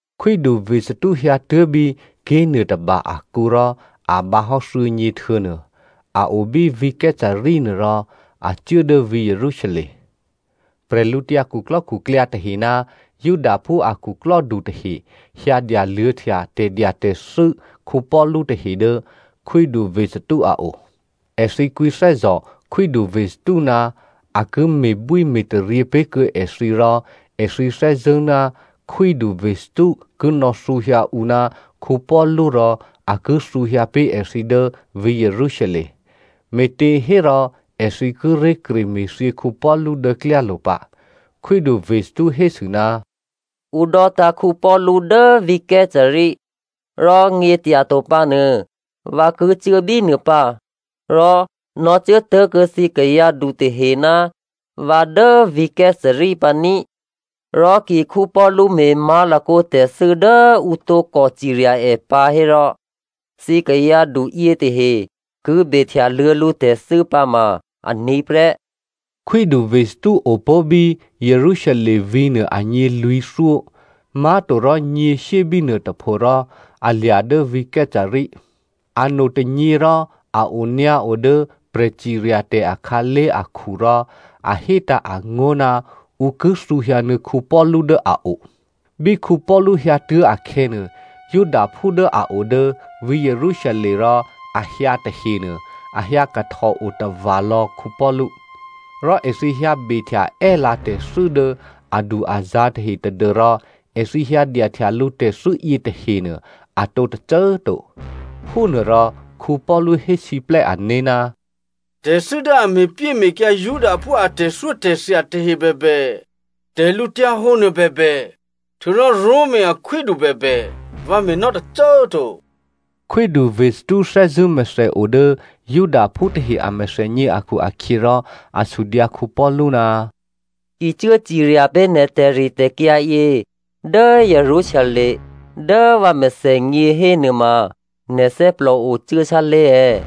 Khwídu Festo hyǎtuố̤ bí ké̤ nuôtôba akǔ rò a bǎhò́ thuô̌nyě htuô̌nuô, a o bí vǐ̤ Caesarea nuô rò a cuố dố vǐ̤ Jerusalem. Bwídukhu tahe ná Judaphú a khuklò́du tahe hyǎ dyaluô̌htya tè̤dyatè̤thû́ Paulu tahe dố khwídu Festo a o. Èthǐ kwǐthè́zò̤ khwídu Festo ná a ki me̤bwíme̤taryě pé̤kuô̌ èthǐ rò èthǐ thè́zṳ̂́ ná khwídu Festo ki nò̌thǔhyǎ ǔ ná Paulu rò a ki thǔhyǎ pé̤ èthǐ dố vǐ̤ Jerusalem, me̤těhérò èthǐ kíré̤ kreme̤thyě Paulu dố klyálo̤ pǎ. Khwídu Festo hésû, “Ǔ dò́tǎ̤ Paulu dố vǐ̤ Caesarea, rò nyě̤tyato pǎnuô, vǎ ki cuố bínuô pǎ. Rò nò̌cuố tố̤kuô̌ thǐ kayǎdu tahe ná vǎ dố vǐ̤ Caesarea pǎ ní꤮, rò ki Paulu me̤má̤lakǒ tè̤thû́ dố ǔ tǒkò cirya è pǎ hérò, thǐ kayǎdu yětahe ki behtyaluô̌ lǔ tè̤thû́ pǎma aní̤ prè́.” Khwídu Festo opó̤ bí Jerusalem vǐ̤nuô anyělwǐ̤thyó, má̤torò nyě̤shyé bínuô tôpho rò a lya̤ dố vǐ̤ Caesarea. Anotônyě rò a onyǎo dố prè̤ciryatè̤ akhǎlé̤ akhu rò a hétǎ̤ angó̤ ná ǔ ki thǔhyǎnuô̌ Paulu dố a o. Bí Paulu hyǎtuố̤ akhè̌nuô, Judaphú dố a o dố vǐ̤ Jerusalem rò a hyǎ tahenuô a hyǎ kahtòo tava̤ lò̌ Paulu. Rò èthǐ hyǎbehtya è́lǎ tè̤thû́ dố adu-azǎ̤ tahe tadû́rò èthǐ hyǎ dyahtya lǔ tè̤thû́ yětahenuô, atǒ tôcô꤮ to. Phúnuôrò Paulu hésiplè́ ané̤, “Tè̤thû́ dố a me̤pyéme̤kyǎ Judaphú a tè̤thyótè̤thya tahe bèbè, tè̤lǔhǒdunuô bèbè, htuô̌rò Roma akhwídu bèbè vǎ me̤nò́ tôcô꤮ to.” Khwídu Festo thè́zṳ̂́ mèthèo dố Judaphú tahe a mèthènyě akhu-akhyěrò, a sudyǎ Paulu, “Ki cuố cirya pé̤ nè̤ tè̤ritè̤kyǎ yě dố Jerusalem dố vǎ mèthènyě hénuôma, nè̤ thè́plòo cuố sálé̤ è̌?”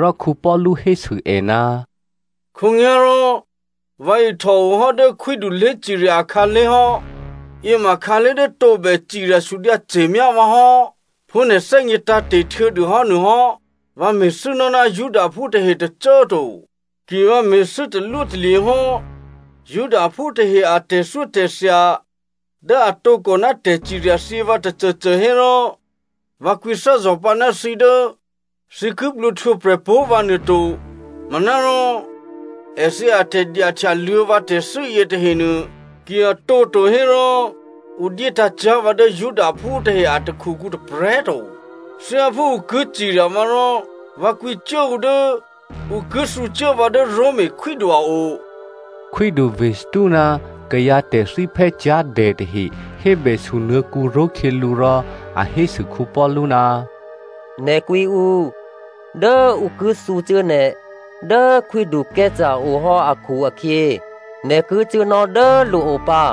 Rò Paulu hésû è, “Khǒnyá̤rò vǎ ihtòohò́ dố khwídu lé̤cirya akhǎlé̤ hò́. Yěma khǎlé̤ dố tǒbè cirya sudyǎce̤myá vǎ hò́. Phú nè̤ thè́gně tǎ̤te̤ htuô̌dûhò́ nuô hò́, vǎ me̤thû́nò́ ná Judaphú tahe tôcô꤮ to. Ki vǎ me̤thû́ talwótalye̤ hò́ Judaphú tahe a tè̤thyótè̤thya dố a tǒkò ná tè̤cirya thyě vǎ tôcôcô hérò, vǎ kwǐthè́zò̤ pǎ ná thǐ dố thǐ ki plwǒ htwǒprè̤ pó̤ vǎ nuôto. Manárò èthǐ atè̤dyahtyaluô̌ vǎ tè̤thû́ yětahe nuô, ki a tǒto hérò ǔ dyétǎ̤cyá̤ vǎ dố Judaphú tahe a takhukǔ tôprè̤꤮ to. Thyáphú ǔ ki cirya vǎ rò vǎ kwǐcuố ǔ dố ǔ ki thǔcuố vǎ dố Roma khwídu a o.” Khwídu Festo ná kayǎ tè̤thíphè́cyá̤dè tahe hébè sunuô̌kǔ ró̤khyělǔ rò a hésû Paulu, “Nè̤ kwǐ ǔ dố ǔ ki thǔcuố nè̤ dố Khwídu Caesare ohò́ akhu-akhyě nè̤ ki cuốnò́ dố lǔo pǎ.”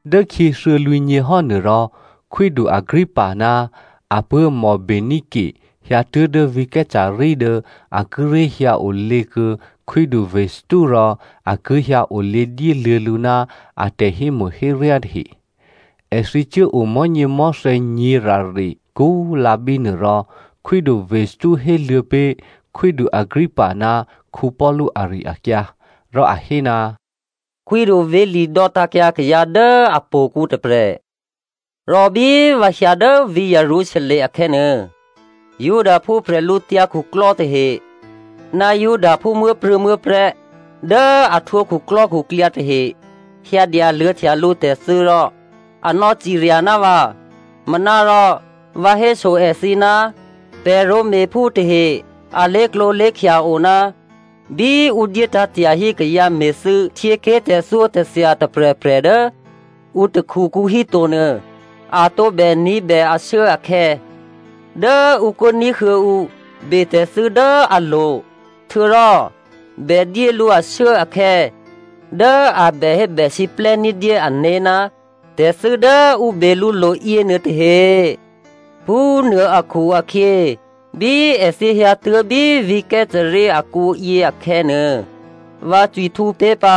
Dốkhyě thuô̌lwǐ̤nyě hò́nuô rò khwídu Agrippa ná apuố̤ Bernice hyǎtuố̤ dố vǐ̤ Caesarea dố a kíré̤ hyǎ olě kuô̌ khwídu Festo rò a ki hyǎ olě dyéluô̌ lǔ ná a tè̤hémo̤héryá tahe. Èthǐ cuốo mò̤́nyěmò̤́thè̌ nyě̤rare kú꤮ lǎ bínuô rò khwídu Festo héluô̌ pé̤ khwídu Agrippa ná Paulu ari-akyǎ. Rò a hé, “Khwídu Felice dò́tǎ̤kyǎ kayǎ dố htò̌kǔ tôprè̤. Rò bí vǎ hyǎ dố vǐ̤ Jerusalem akhè̌nuô, Judaphú prè̤lǔtyǎ khuklò́ tahe ná Judaphú muố̤prû̌muố̤prè̤́ dố a htwǒ khuklò́khuklyǎ tahe hyǎ dyaluô̌htya lǔ tè̤thû́ rò a nò̌cirya ná vǎ. “Manárò vǎ héso èthǐ ná pè̤ Romaphú tahe a lé̤klǒlé̤khya o, bí ǔ dyétǎ̤ tyahí kayǎ me̤thû́ htyěké̤ tè̤thyótè̤thya tôprè̤prè̤ dố ǔ takhukǔ hítonuô, a tǒbè ní̤bè ashuốakhè̌ dố ǔ ki ní̤huô̌ ǔ betè̤thû́ dố alo̤, htuô̌rò bè dyé lǔ ashuốakhè̌ dố a bè hébèsiplè́ ní̤dyé ané̤ ná tè̤thû́ dố ǔ be lǔlo̤ yěnuô tahe. Phúnuô akhu-akhyě, bí èthǐ hyǎtuố̤ bí vǐ̤ Caesarea akǔ yěakhè̌nuô, vǎ cwihtǔ pé̤ pǎ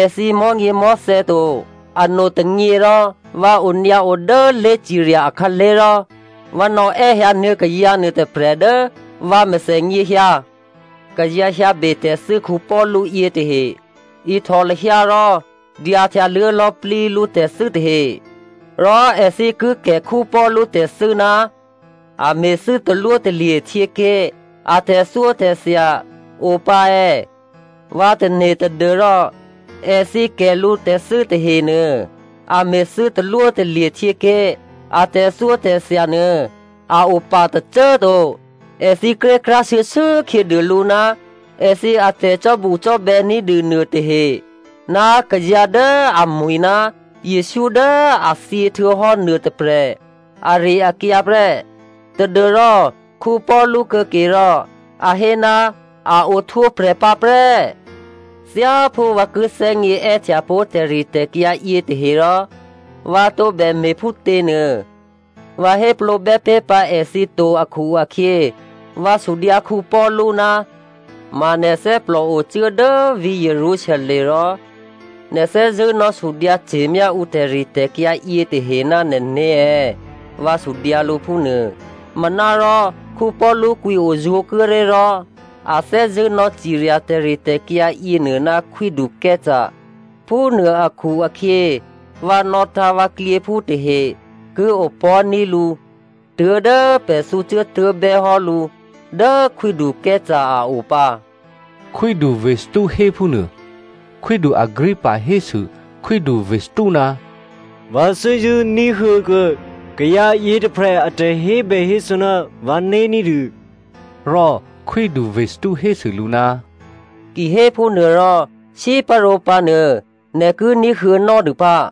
èthǐ mò̤́nyěmò̤́thè̌ to. Anotônyě rò vǎ onyǎo dố lé̤cirya akhǎlé̤ rò vǎ nò̌ è́hyǎnuô̌ kayǎ nuôtôprè̤ dố vǎ mèthènyěhyǎ. Kayǎ hyǎ betè̤thû́ Paulu yětahe ihtò lahyǎ rò dyahtyaluô̌ lò̌plǐ lǔtè̤thû́ tahe. Rò èthǐ ki kè̤ Paulu tè̤thû́ ná a me̤thû́ talwótalye̤ htyěké̤ a tè̤thyótè̤thya o pǎ è̌ vǎ tane̤ tadû́rò èthǐ kè̤ lǔ tè̤thû́ tahenuô, a me̤thû́ talwótalye̤ htyěké̤ a tè̤thyótè̤thya nuô a opa tôcô꤮ to. Èthǐ krékryá̤ shuô̌shuô̌ khyědû lǔ ná èthǐ atè̤cò́bucò́bè̌ ní̤dû nuôtahe ná kayǎ dố amwi̤ ná Jesǔ dố a thyěhtuô̌hò́ nuôtôprè̤ ari-akyǎ prè́, tadû́rò Paulu kuô̌ke rò a hé ná a o htwǒprè̤ pǎprè́. Thyáphú vǎ ki thè́gně è́htyapó̤ tè̤ritè̤kyǎ yětahe rò, vǎ tǒbè me̤phútěnuô vǎ héplǒbè́ pé̤ pǎ èthǐ to akhu-akhyě, vǎ sudyǎ Paulu ná ma nè̤ thè́plòo cuố dố vǐ̤ Jerusalem rò nè̤ thè́zṳ̂́ nò̌sudyǎ ce̤myá ǔ tè̤ritè̤kyǎ yětahe ná nè̤né̤ è̌? Vǎ sudyǎ lǔ phúnuô. Manárò Paulu kwǐozyǒ kuốré̤ rò a thè́zṳ̂́ nò̌cirya tè̤ritè̤kyǎ yěnuô ná Khwídu Caesare. Phúnuô akhu-akhyě, vǎ nò̌tǎ̤ vǎ klyěphú tahe ki opò̤́ ní̤ lǔ tuố̤dố pè̤ thǔcuố tuố̤bè́ hò́ lǔ dố Khwídu Caesare a o pǎ,” khwídu Festo hé phúnuô. Khwídu Agrippa hésû khwídu Festo, “Vǎ thè́zṳ̂́ ní̤huô̌kuô̌ kayǎ yětôprè̤ a tè̤hébèhésû̌ ná vǎné̤ ní̤dû.” Rò khwídu Festo hésû lǔ, “Ki héphúnuô rò shyéparǒ pǎnuô nè̤ ki ní̤huô̌nò́ dû pǎ.”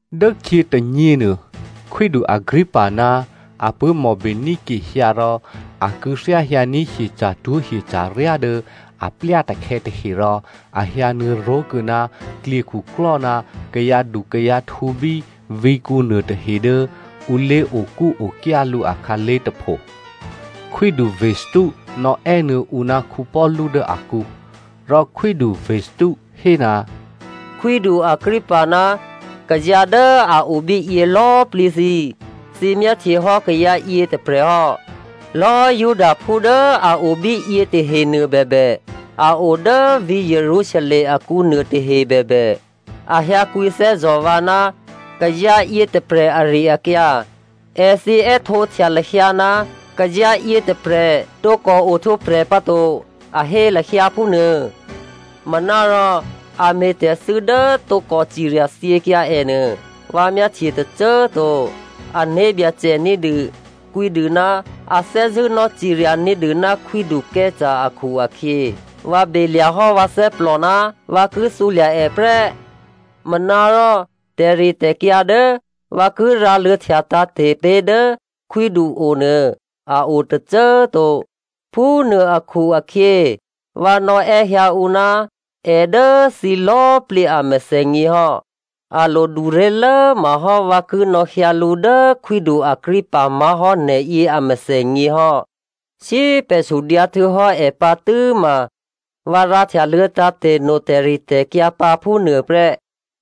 Dốkhyě tônyěnuô, khwídu Agrippa ná apuố̤ Bernice hyǎ rò a kû̌thyá hyǎní̤ hyeca̤twó̤ hyeca̤ryá dố a plyatakhè̌ tahe rò a hyǎnuô̌ ró̤kuô̌ ná klyěkhuklò́ ná kayǎdukayǎhtǔ bí vǐ̤kǔ nuôtahe dố ǔ lé̤okúokyá lǔ akhǎlé̤ tôpho. Khwídu Festo nò̌è́nuô̌ ǔ ná Paulu dố akǔ. Rò khwídu Festo hé, “Khwídu Agrippa ná kayǎ dố a o bíyě lò̌꤮ plǐ thǐ꤮, thǐ myáhtyehò́ kayǎ yětôprè̤ hò́. Lò̌꤮ Judaphú dố a o bíyě tahenuô bèbè, a o dố vǐ̤ Jerusalem akǔ nuôtahe bèbè, a hyǎ kwǐthè́zò̤ vǎ ná kayǎ yětôprè̤ ari-akyǎ. Èthǐ è́htǒhtya lahyǎ ná kayǎ yětôprè̤ tǒkò ohtwǒprè̤ pǎto, a hé lahyǎ phúnuô. Manárò, a me̤ tè̤thû́ dố tǒkò cirya thyěkyǎ ènuô vǎ myáhtye tôcô꤮ to. Ané̤byacè ní̤dû kwǐdû ná a thè́zṳ̂́ nò̌cirya ní̤dû ná Khwídu Caesare akhu-akhyě, vǎ belya̤hò́ vǎ thè́plò ná vǎ ki thǔlya̤ è prè́. Manárò, tè̤ritè̤kyǎ dố vǎ ki rǎluô̌htya tǎ̤te̤ pé̤ dố khwídu onuô, a o tôcô꤮ to. Phúnuô akhu-akhyě vǎ nò̌è́hyǎ ǔ ná è dố thǐ lò̌꤮ plǐ a mèthènyě hò́. A lodu ré̤lốma hò́ vǎ ki nò̌hyǎ lǔ dố khwídu Agrippa má̤hò́ nè̤yě a mèthènyě hò́. Shyé꤮ pè̤ sudyǎ htuô̌hò́ è pǎ tû́ma vǎ rǎhtyaluô̌ tǎ̤te̤no tè̤ritè̤kyǎ pǎ, phúnuôprè́.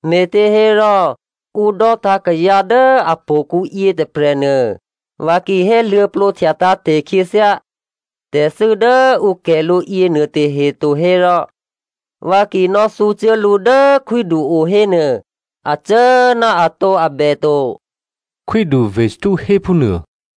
Me̤těhérò ǔ dò́tǎ̤ kayǎ dố htò̌kǔ yětôprè̤nuô, vǎ ki héluô̌plǒhtya tǎ̤te̤ khyěthyá tè̤thû́ dố ǔ kè̤ lǔ yěnuôtahe to hérò vǎ ki nò̌thǔcuố lǔ dố khwídu o hénuô, a cô꤮ ná atǒabè to,” khwídu Festo hé phúnuô.